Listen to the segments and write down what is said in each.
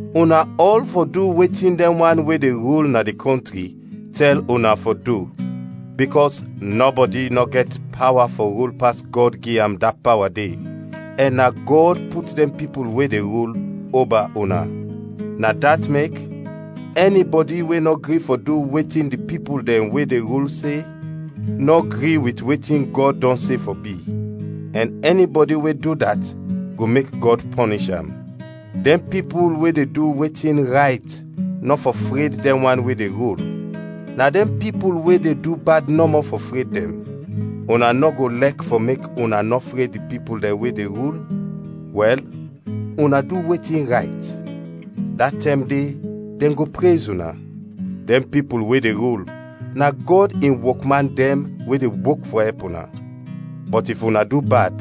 Una ɔl fɔ du wetin dɛn wan we de rul na di kɔntri tɛl una fɔ du, bikɔs nɔbɔdi nɔ go gɛt pawa fɔ rul pas Gɔd gi am da pawa de, ɛn na Gɔd put dɛn pipul we de rul, oba una. Na dat mek, ɛnibɔdi we nɔ gri fɔ du wetin di pipul dɛn we de rul se, nɔ gri wit wetin Gɔd dɔn se fɔ bi; ɛn ɛnibɔdi we du dat go mek Gɔd pɔnish am. Dɛn pipul we de du wetin rayt nɔ fɔ fred dɛn wan we de rul; na dɛn pipul we de du bad nɔmɔ fɔ fred dɛn. Una nɔ go lɛk fɔ mek una nɔ fred di pipul dɛn we de rul? Wɛl, una du wetin rayt, da tɛm de dɛn go prez una. Dɛn pipul we de rul, na Gɔd in wokman dɛn we de wok fɔ ɛp una. Bɔt if una du bad,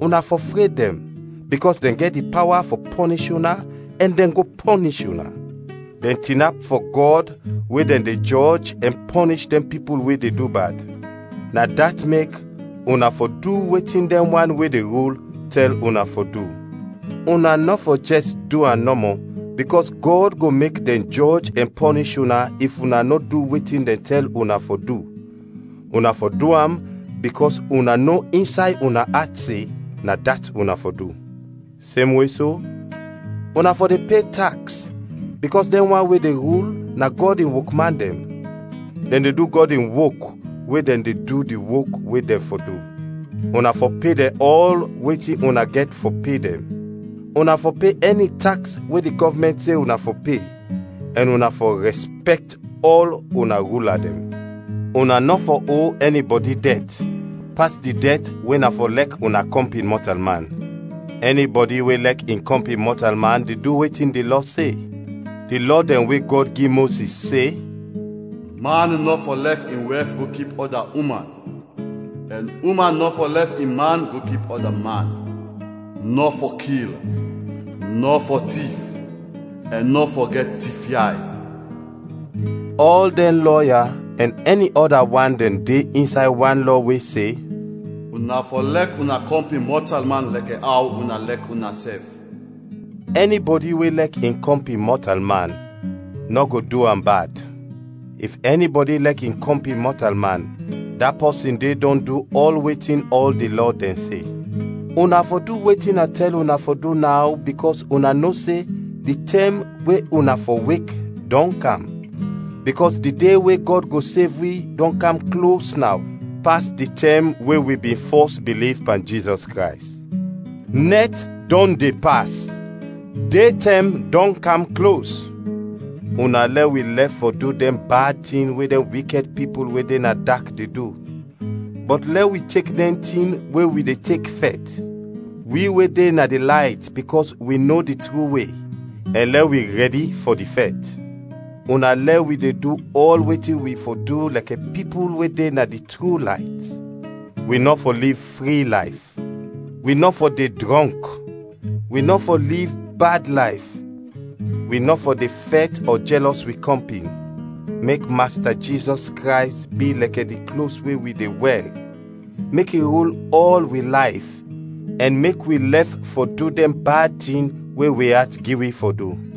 una fɔ fred dɛn, bikɔs dɛn gɛt di pawa fɔ pɔnish una ɛn dɛn go pɔnish una. Dɛn tinap fɔ Gɔd we dɛn de jɔj ɛn pɔnish dɛn pipul we de du bad. Na dat mek una fɔ du wetin dɛn wan we de rul tɛl una fɔ du. Una nɔ fɔ jɛs du am nɔmɔ bikɔs Gɔd go mek dɛn jɔj ɛn pɔnish una if una nɔ du wetin dɛn tɛl una fɔ du, una fɔ du am bikɔs una no insay una at se, na dat una fɔ du. Semwe so, una fɔ de pe taks bikɔs dɛn wan we de rul, na Gɔd in wokman dɛn. Dɛn de du Gɔd in wok we dɛn de du di wok we dɛn fɔ du. Una fɔ pe dɛn ɔl wetin una gɛt fɔ pe dɛn; una fɔ pe ɛni taks we di gɔvmɛnt se una fɔ pe, ɛn una fɔ rɛspɛkt ɔl una rula dɛn. Una nɔ fɔ o ɛnibɔdi dɛt, pas di dɛt we na fɔ lɛk una kɔmpin mɔtalman. Ɛnibɔdi we lɛk in kɔmpin mɔtalman de du wetin di Lɔ se. Di lɔ dɛn we Gɔd gi Mozis se, “Man nɔ fɔ lɛf in wɛf go kip ɔda uman ɛn uman nɔ fɔ lɛf in man go kip ɔda man; nɔ fɔ kil; nɔ fɔ tif; ɛn nɔ fɔ gɛt tifyay” ɔl dɛn lɔ ya ɛn ɛni ɔda wan dɛn de insay wan lɔ we se, “Una fɔ lɛk una kɔmpin mɔtalman lɛkɛ aw una lɛk unasɛf.” Ɛnibɔdi we lɛk in kɔmpin mɔtalman, nɔ go du am bad. If ɛnibɔdi lɛk in kɔmpin mɔtalman, da pɔsin de dɔn du ɔl wetin ɔl di lɔ dɛn se. Una fɔ du wetin a tɛl una fɔ du naw bikɔs una no se di tɛm we una fɔ wek, dɔn kam, bikɔs di de we Gɔd go sev wi dɔn kam klos naw pas di tɛm we wi bin fɔs biliv pan Jizɔs Krays. Nɛt dɔn de pas, de tɛm dɔn kam klos. Una lɛ wi lɛf fɔ du dɛn bad tin we dɛn wikɛd pipul we de na dak de du, bɔt lɛ wi tek dɛn tin we wi de tek fɛt, wi we de na di layt bikɔs wi no di tru we, ɛn lɛ wi rɛdi fɔ di fɛt. Una lɛ wi de du ɔl wetin wi fɔ du lɛkɛ pipul we de na di tru layt; wi nɔ fɔ liv fri layf, wi nɔ fɔ de drɔnk, wi nɔ fɔ liv bad layf, wi nɔ fɔ de fɛt ɔ jɛlɔs wi kɔmpin. Mek Masta Jizɔs Krays bi lɛkɛ di klos we wi de wɛr, mek i rul ɔl wi layf, ɛn mek wi lɛf fɔ du dɛn bad tin we wi at gi wi fɔ du.